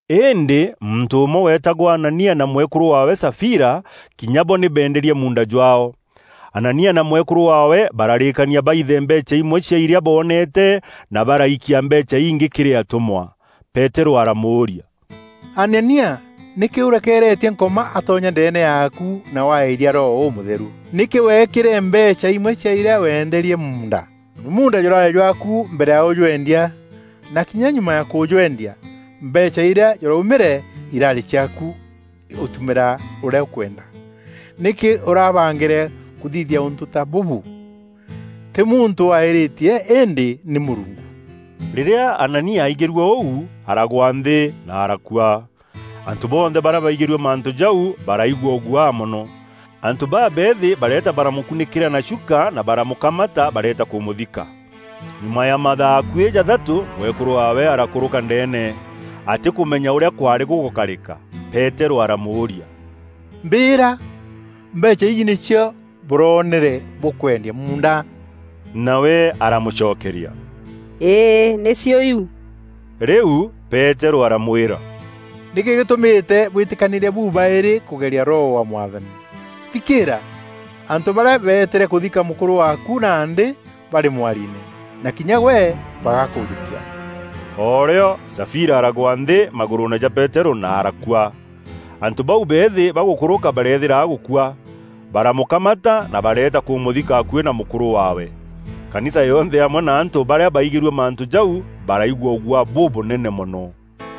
Îndî muntû ûmwe weetagwa Anania na mwekûrû waawe Safira, kinya bo nî beenderie muunda jwaao. Anania na mwekûrû waawe bararîkania baithe mbeecha imwe cia irîa boonete na baraikia mbeecha ingî kîrî atûmwa. Peterû aramûria, “Anania, nîkî ûrekeeretie Nkoma atonya ndeene yaaku na waaîria Roho Ûmûtheru. Nîkî weekîre mbeecha imwe cia iria weenderie muunda? Munda jûrarî jwaaku mbere ya ûjweendia na kinya nyuma ya kûjweendia, mbeecha irîa jûraumîre, iraarî ciaaku ûtumîra ûrîa ûkwenda. Nîkî ûrabangîre kûthithia ûntû ta bûbû? Tî muntû waîîrîtie îndî nî Mûrungu.” Rîrîa Anania aaigîrue ûu, aragwa nthî, na arakua. Antû bonthe barîa baigîrue mantû jau baraigua ûguaa mono. Antû babeethî bareeta baramûkunîkîra na chuka na baramûkamata bareeta kûmûthika. Nyuma ya mathaa akuî jathatû, mwekûrû waawe arakûrûka ndeene, atîkûmenya ûrîa kwaarî gûgûkarîka. Peterû aramûûria, “Mbîîra! Mbeecha iji nîcio bûroonere bûkwendia muunda?” Nawe aramûcokeria, “Îî, nîcio iu.” Rîu Peterû aramwîra, “Nîkî gîtûmîte bwîtîkanîîria bu-baîrî kûgeria Roho wa Mwathani? Thikîîra! Antû barîa beetîre kûthika mûkûrû waaku, nandî barî mwariine, na kinya gwe bagakûjûkia.” O rîo Safira aragwa nthî magûrûûne ja Peterû, na arakua. Antû bau beethî bagûkûrûka bareethîra agûkua. Baramûkamata na bareeta kûmûthika akuî na mûkûrû waawe. Kanisa yonthe amwe na antû barîa baigîrue mantû jau, baraigua ûguaa bûbûnene mono.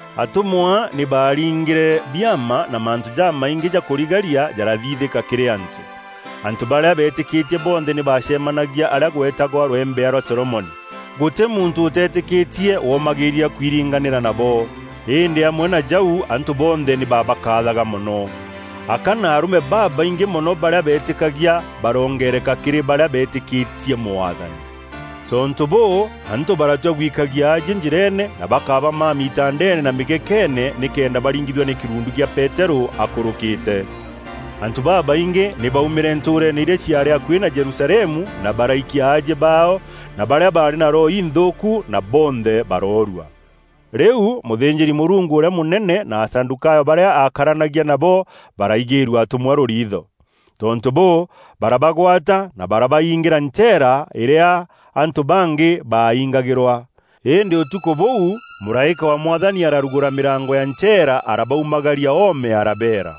Atûmwa nî baaringîre biama na mantû jamaingî ja kûrigaria jarathithîka kîrî antû. Antû barîa beetîkîtie bonthe nî baacemanagia arîa gweetagwa Rwembea rwa Solomoni. Gûtî muntû ûteetîkîtie womagîîria kwiringanîra nabo. Îndî amwe na jau antû bonthe nî babakaathaga mono. Aka na arûme babaingî mono barîa beetîkagia baroongereka kîrî barîa beetîkîtie Mwathani. Tontû bûû, antû baratua gwikagia aajie njîreene na bakabamamia itandeene na mîgekeene nîkenda baringithua nî kîrundu gîa Peterû akûrûkîte. Antû babaingî nî baaumîre ntûûreene irîa ciaarî akuî na Jerusalemu na baraikia aajie baao na barîa baarî na roho inthûûku, na bonthe baroorua. Rîu mûthînjîri-Mûrungu ûrîa mûnene na Asadûkayo barîa aakaranagia nabo baraigîîrua atûmwa rûriitho. Tontû bûû, barabagwata na barabaingîra ncheera îrîa antû bangî baaingagîrwa. Îndî ûtukû bûû, mûraîka wa Mwathani ararugûra mîrango ya ncheera arabaumagaria oome arabeera,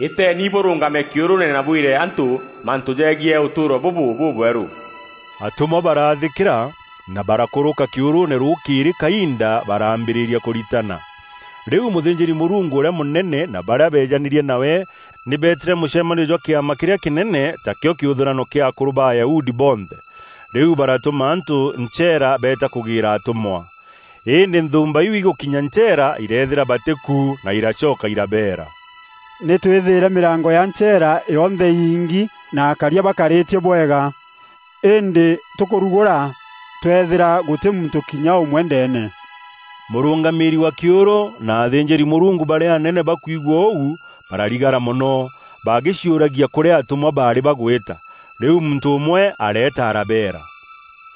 “Îteeni bûrûngame kîûrûûne na bwîre antû mantû jegiî ûtûûro bûbû bûbwerû.” Atûmwa baraathîkîra, na barakûrûka kîûrûûne rûkîîrî kainda baraambîrîria kûritana. Rîu mûthînjîri-Mûrungu ûrîa mûnene na barîa beejanîrie nawe, nî beetîre mûcemanio jwa Kîama kîrîa kînene, takîo kîûthûrano kîa akûrû ba Ayahudi bonthe. Rîu baratûma antû ncheera beeta kûgîîra atûmwa. Îndî nthûûmba iu îgûkinya ncheera, ireethîra batî ku na iraacoka irabeera, “Nî twîthîre mîrango ya ncheera yonthe îingi na akaria bakarîtie bwega. Îndî tûkûrugûra, twethîra gûtî muntû kinya ûmwe ndeene.” Mûrûngamîîri wa kîûrû na athînjîri-Mûrungu barîa anene bakwigua ûu, bararigara mono bagîciûragia kûrîa atûmwa baarî bagwîta. Rîu muntû ûmwe areeta arabeera,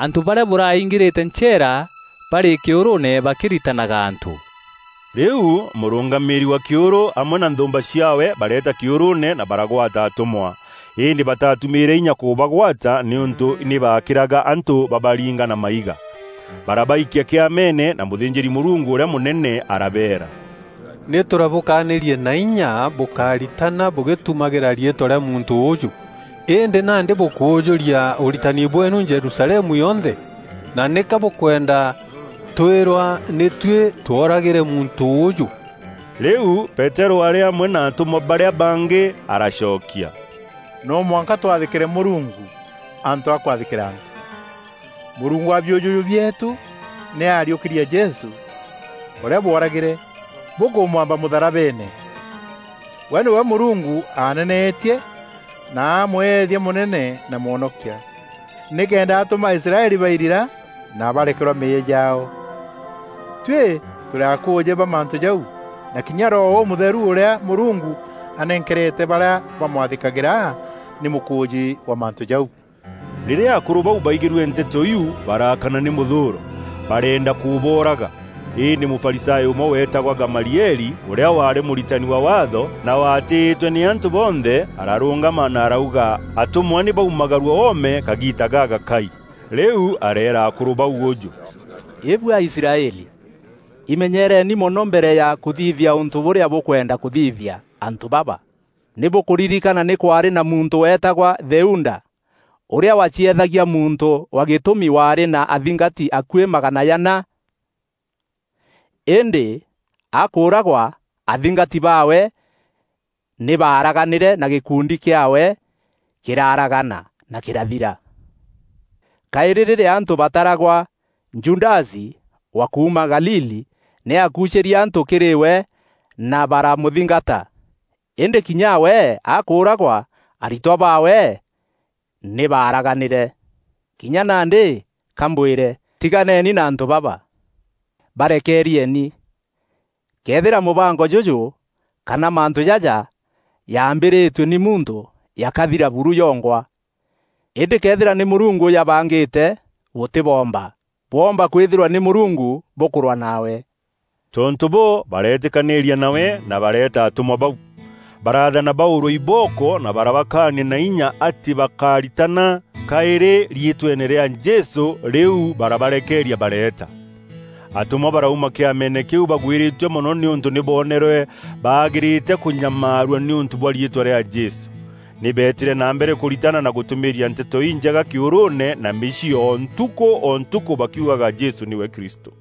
“Antû barîa bûraingîrîte ncheera barî kîûrûûne bakîritanaga antû.” Rîu mûrûngamîîri wa kîûrû amwe na nthûûmba ciaawe bareeta kîûrûûne na baragwata atûmwa. Îndî bataatumîîre inya kûbagwata nîûntû nî baakîraga antû babaringa na maiga. Barabaikia Kîameene na mûthînjîri-Mûrungu ûrîa mûnene arabeera, “Nî tûrabûkanîrie na inya bûkáritana bûgîtumagîra riîtwa rîa muntû ûûjû, îndî nandî bûkûûjûria ûritani bweenu Jerusalemu yonthe, na nîka bûkwenda tuîrwa nî tuî tworagîre muntû ûûjû.” Rîu Peterû arî amwe na atûmwa barîa bangî aracokia, “No mwanka twathîkîre Mûrungu, antû a kwathîkîra antû. Mûrungu wa biûjûjû bieetû nî aariûkîrie Jesû, ûrîa bworagîre, bûkûmwamba mûtharabeene. We nîwe Mûrungu aneneetie na amweethia Mûnene na Mwonokia, nîkenda atûma Aisraeli bairira, na barekerwa meeyia jaao. Tuî tûrî akûûjî ba mantû jau, na kinya Roho Ûmûtheru ûrîa Mûrungu anenkerete barîa bamwathîkagîra, nî mûkûûjî wa mantû jau.” Rîrîa akûrû bau baigîrue nteto iu, baraakana nî mûthûûro, bareenda kûbooraga. Îndî Mûfarisayo ûmwe weetagwa Gamalieli, ûrîa waarî Mûritani wa Waatho na waatîîtwe nî antû bonthe, ararûngama na arauga atûmwa nî baumagarue oome kagiita gagakai. Rîu areera akûrû bau ûjû, “Îbuî Aisraeli, imenyereeni mono mbere ya kûthithia ûntû bûrîa bûkwenda kûthithîria antû baba! Nî bûkûririkana nî kwaarî na muntû weetagwa Theuda, ûrîa waacieethagia muntû wa gîtûmi waarî na athingati akuî magana jana. Îndî akûûragwa, athingati baawe nî baaraganîre na gîkundi kîaawe kîraaragana na kîrathira. Kaîrî, rîrîa antû baataragwa, Judasi wa kuuma Galili, nî aakuucîrie antû kîrî we na baramûthingata. Îndî kinya we akûûragwa, aritwa baawe nî baaraganîre. Kinya nandî, ka mbwîre, tiganeni na antû baba. Barekeerieni! Këethîra mûbango jûjû kana mantû jaja jaambîrîtue nî muntû, jakathira buru jongwa. Îndî këethîra nî Mûrungu ûjabangîte, bûtîboomba. Bwomba kwîthîrwa nî Mûrungu bûkûrwaa nawe.” Tontû bûû, bareetîkanîîria nawe na bareeta atûmwa bau. Baraathana baûrwe ibooko na barabakaania na inya atî bakaritana kaîrî riîtweene rîa Jesû, rîu barabarekeeria bareeta. Atûmwa barauma kîameene kîu bagwîrîtue mono nîûntû nî boneerwe baagîrîte kûnyamarua nîûntû bwa riîtwa rîa Jesû. Nî beetîre na mbere kûritana na gûtûmîîria Nteto Injega kîûrûûne na mîciî o ntukû o ntukû bakiugaga Jesû nîwe Kristû.